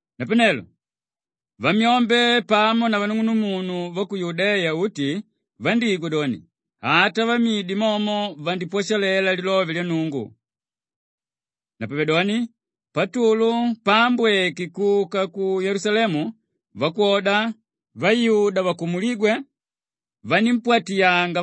Napanelo vamyombe pamo na vanung'unumunu ku Yudeya uti vandígwa doni, ata vamidi momo vandipwashalela lilove lya Nnungu. Napavedoni Patulu paambweke kuka ku Yelusalemu, vakwoda vayuda vakumulígwe vanímpwatiyanga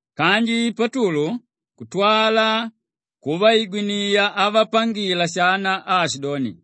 Kanji Patulu kutwala kuvaigwiniya avapangila shana aashidoni,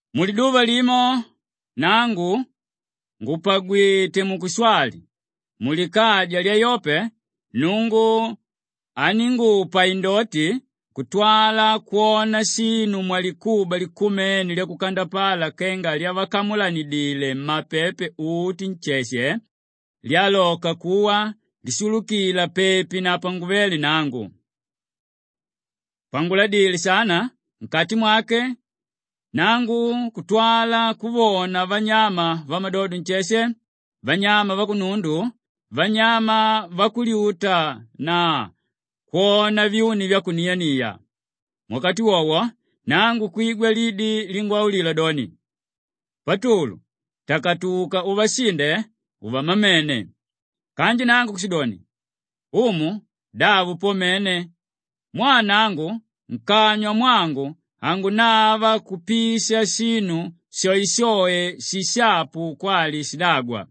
“Muliduva limo nangu ngùpagwite mukushwali mulikaja lya Yope, Nnungu aníngupa indoti kutwala kwona shinu mwalikuba likumene lyakukandapala kenga lyavakamulanidile mmapepe uti nsheshe lyaloka kuwa lishulukila pepi na panguvéle nangu. Panguladile shana nkati mwake, nangu kutwala kuvona vanyama vamadodo nsheshe, vanyama vakunundu, vanyama vakulyuta na kwona vyuni vyakuniania. Muwakati wowo nangu kwigwa lidi lingwaulila doni, ‘Patulu! Takatuka uvashinde uvamamene!’ Kanji nangu kushidoni, ‘Umu, davo po mene! Mwaa nangu nkanywa mwangu hangunava kupisha shinu shoeshoe shishapu kwali shidagwa.’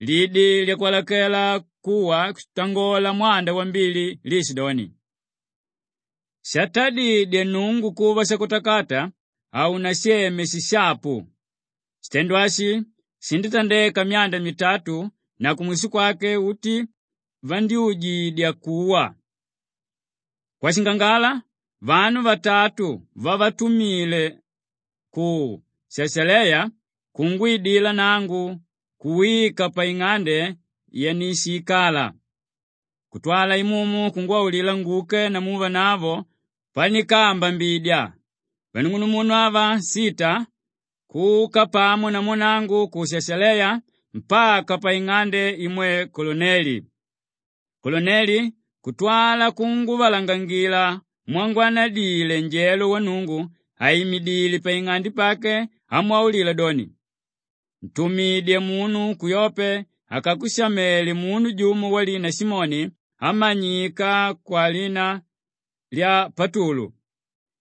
Lidi lyakwalakela kuwa kutangola mwanda wambili liishidoni, ‘Shatadidye Nnungu kuva shakutakata, haunasheme shishapu.’ Shitendo ashi shindítandeka myanda mitatu na kumwisho kwake, uti vandyújidya kuwa. Kwashingangala, vanu vatatu vavatumile ku Shashaleya kungwidila nangu kuwika paing'ande yanishiikala. Kutwala Imumu kungwaulila nguke namu vanavo pandikaambambidya; Kwali: …pandikapambula. vanung'unumunu ava sita kuka pamo namu nangu ku Shashaleya mpaka paing'ande imwe Koluneli. Koluneli kutwala kutuvalangangila mwamwanadile njelo wa Nnungu àimidile paing'ande pake amwaulila doni, ‘Ntumidye munu ku Yope akakushamele munu jumo walina Simoni ámanyika kwalina lya Patulu.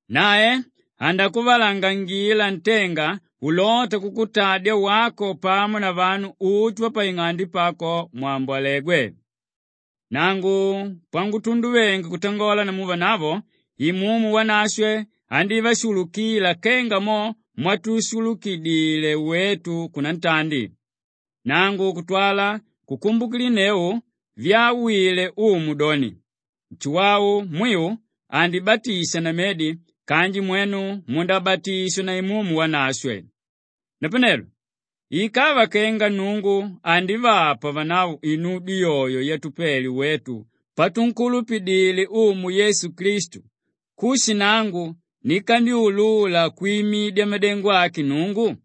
Nae andakuvalangangila ntenga ulóta kukutadya wako pamo na vanu uti vapaing'ande pako mwambolegwe.’ Nangu pangutunduvenge kutangola namu vanavo Imumu Wanashwe andívashulukila kenga momo mwatushulukidile wetu kunantandi. Nangu kutwala kukumbukilinneu vyawile Umu doni, Nshuwau mwiu andibatisha na medi kanji mwenu mundabatishwa na Imumu Wanashwe. Napanelo ikava kenga Nnungu andivapa vanavo inudyo yoyo yatupele wetu patunkulupidile Umu Yesu Klistu, kushi nangu nikandyulula kwimidya madengo ake Nnungu?”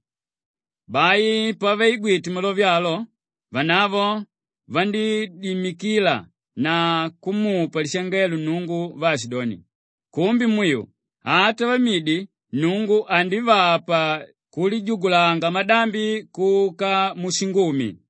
Bai pavaigwite malove alo, vanavo vandídimikila na kumupa lishangelo Nnungu vaashidoni, “Kumbe mwiu! Ata vamidi Nnungu andivapa kulijugulanga madambi kuka mushingumi.”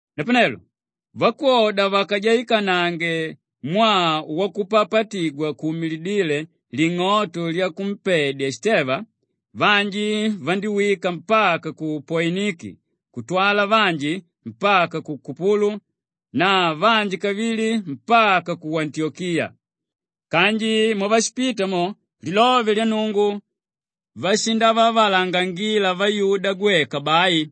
Napanelo vakwoda vakajaikanange mwaa wakupapatigwa kuumilidíle ling'oto lyakumpedya Shiteva, vanji vandíwika mpaka ku Poiniki kutwala vanji mpaka ku Kupulu na vanji kavili mpaka ku Antiyokiya. Kanji mwavashipita mo, lilove lya Nnungu vashivavalangangila vayuda gweka bai.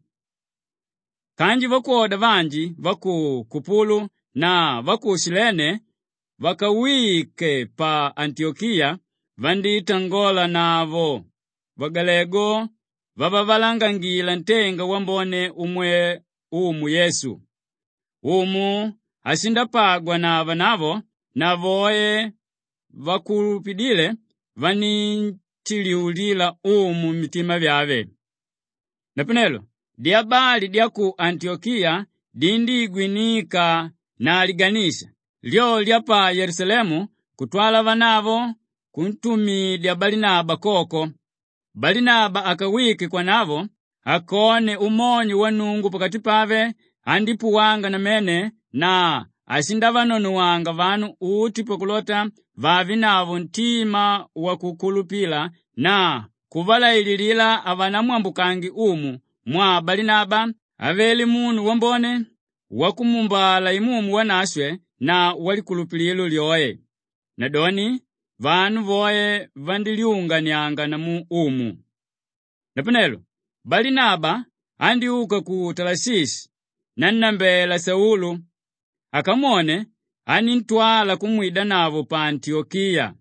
Kanji vakwoda vanji va ku Kupulu na va ku Shilene vakawike pa Antiyokiya, vandítangonavo vagalegu vavavalangangila ntenga wambone umwe Umu Yesu. Umu ashindapagwa na vanavo na voe vakulupidíle, vanínshinjiulila Umu mitima vyave. Napanelo dyabali dya ku Antiyokiya dindíigwinika na liganisha, lyo lya pa Yelusalemu kutwala vanavo kuntumidya Balinaba koko. Balinaba akawike kwanavo akone umonyo wa Nnungu pakati pave andípuwanga namene na ashindavanonowanga vanu uti pakulota vavenavo ntima wakukulupilika na kuvalaililila havanamwambukange Umu mwaa Balinaba avele munu wambone, wakumuumbala Imumu Wanashwe na walikulupililo lyoe. Nadoni vanu voe vandílyunganianga namu Umu. Napanelo Balinaba andyúka ku Talashishi nannambela Saulu. Akamwone, aníntwala kumwidanavo pa Antiyokiya.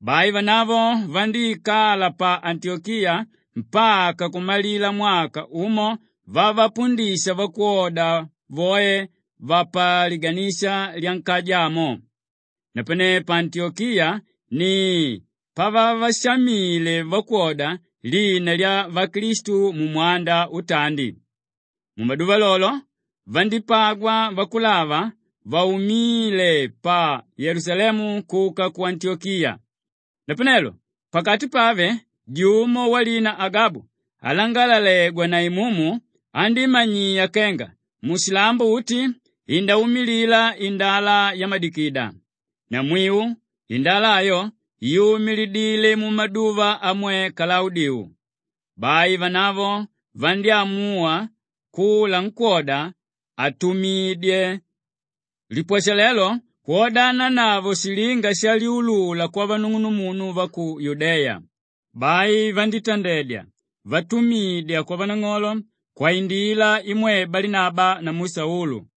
Bai vanavo vandíikala pa Antiyokiya mpaka kumalila mwaka umo vavapundisha vakwoda voe vapaliganisha lyankaja amo. Napane pa Antiyokiya ni pavavashamíle vakwoda lina lya Vaklistu mumwanda utandi. Mumaduva lolo, vandípagwa vakulava vaumíle pa Yelusalemu kuka ku Antiyokiya. Napanelo pakati pave jumo walina Agabu alangalalegwa na Imumu, andímanyiya kenga mushilambo uti indaumilila indala yamadigida. Namwiu indala ayo yumilidile mumaduva amwe Kalaudiu. Bai vanavo vandyámuwa kula nkwóda atumidye lipwashalelo kwodananavo shilinga shalyulula kwavanung'unumunu va ku Yudeya. Bai vandítandedya vatumidya kwavanang'olo kwaindila imwe Balinaba namu Saulu.